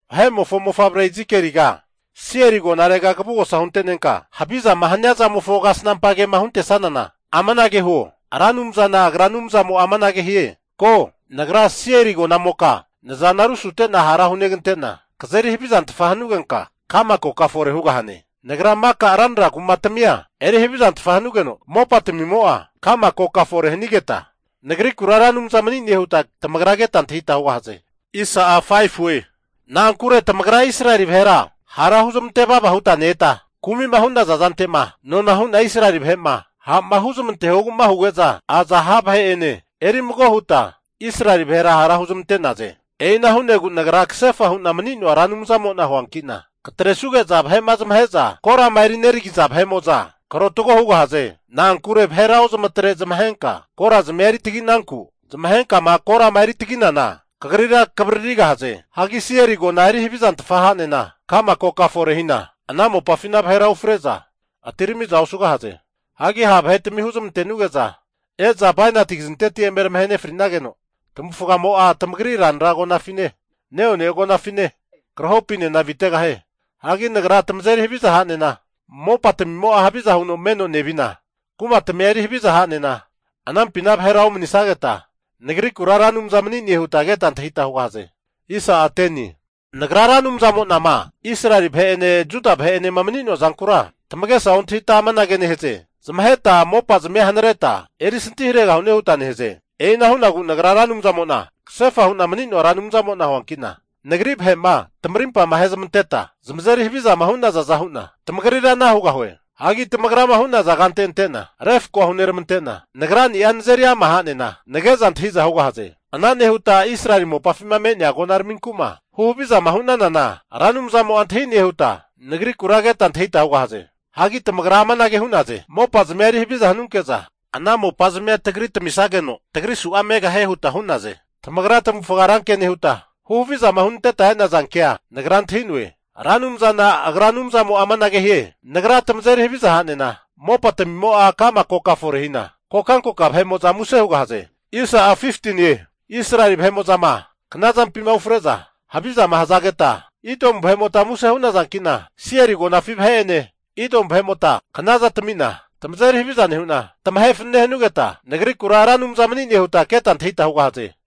Vahe'mofo mofavre Izikieliga, Seiri agonarega kavugosa hunte'nenka, havizama hania zamofo kasnampa kema huntesanana, amanage huo, Ra Anumzana Agra Anumzamo'a amanage hie, ko, Nagra Seiri agonamoka nazana rusutena hara hunegante'na, kazeri havizantfa hanugenka ka'ma koka fore hugahane. Nagra maka ranra kumatamia eri havizantfa hanugeno mopatamimo'a ka'ma koka fore hanigeta, Nagrikura Ra Anumza mani'ne huta tamagra keta antahita hugahaze. Na'ankure tamagra Israeli vahera hara huzmante vava huta ne-eta, kumi'ma hu'naza zante'ma nona hu'na Israeli vahe'ma ha' huzmantehogu'ma huge'za aza ha' vahe'ene eri mago huta Israeli vahera hara huzmante'naze. E'ina hu'negu Nagra kasefa hu'na mani'noa Ra Anumzamo'na huanki'na, katresuge'za vahe'ma zamahe'za korama eri neragi'za vahe'mo'za karotago hugahaze. Na'ankure vahera ozamatre zamahenka korazmia eri taginanku, zamahenkama korama eri tagi'nana vahe'mo'za kagrira kavaririgahaze. Hagi Seiri agona eri havizantfa ha'nena ka'ma koka fore hina, ana mopafina vahera ufre'za atiramiza osugahaze. Hagi ha' vahetami huzmantenuge'za e'za bainati kazinteti eme tamahe fri'nageno, tamavufgamo'a tamagri ranra agonafine, neone agonafine krahopinena avitegahie. Hagi Nagra tamazeri haviza ha'nena mopatamimo'a haviza huno meno nevi'na, kumatamia eri haviza hanena anampina vahera omanisageta, Nagrikura Ra Anumza mani'ne huta keta antahita hugahaze. Nagra Ra Anumzamo'nama Israeli vahe'ene Juda vahe'enema mani'noa zankura tamagesa ontahita amanage nehaze, zamaheta mopazmia hanareta erisanti haregahune huta nehaze. E'ina hu'negu Nagra Ra Anumzana kasefa hu'na mani'noa Anumzamo'na huankina, Nagri vahe'ma tamarimpama ahezmanteta zamazeri havizama hu'nazaza hu'na, tamagrira ana hugahue. Hagi tamagrama hu'naza kante antena refkoa huneramante'na, Nagrani'a nazeri ama ha'nena, nage'za antahiza hugahaze. Ana nehuta Israeli mopafima me'nea agonaraminku'ma huhavizama hu'nanana Ra Anumzamo'a antahi'ne huta Nagrikura keta antahita hugahaze. Hagi tamagra amanage hu'naze, mopazmia eri haviza hanunke'za ana mopazmia tagri tamisageno tagri su'za megahie huta hu'naze. Tamagra tamavufga ranke nehuta, huhavizama hunanteta e'naza kea Nagra antahi'noe. Ra Anumzana Agra Anumzamo'a amanage hie, Nagra tamazeri haviza ha'nena mopatamimo'a ka'ma koka fore hina, kokankoka vahe'mo'za muse hugahaze. Israeli vahe'mo'zama knazampima ufre'za havizama hazageta Idomu vahe'mota muse hu'nazankina, Seiri agonafi vahe'ene Idomu vahe'motanena knazana tamina, tamazeri haviza nehu'na tamahe fanane hanugeta, Nagrikura Ra Anumza mani'ne huta keta antahita hugahaze.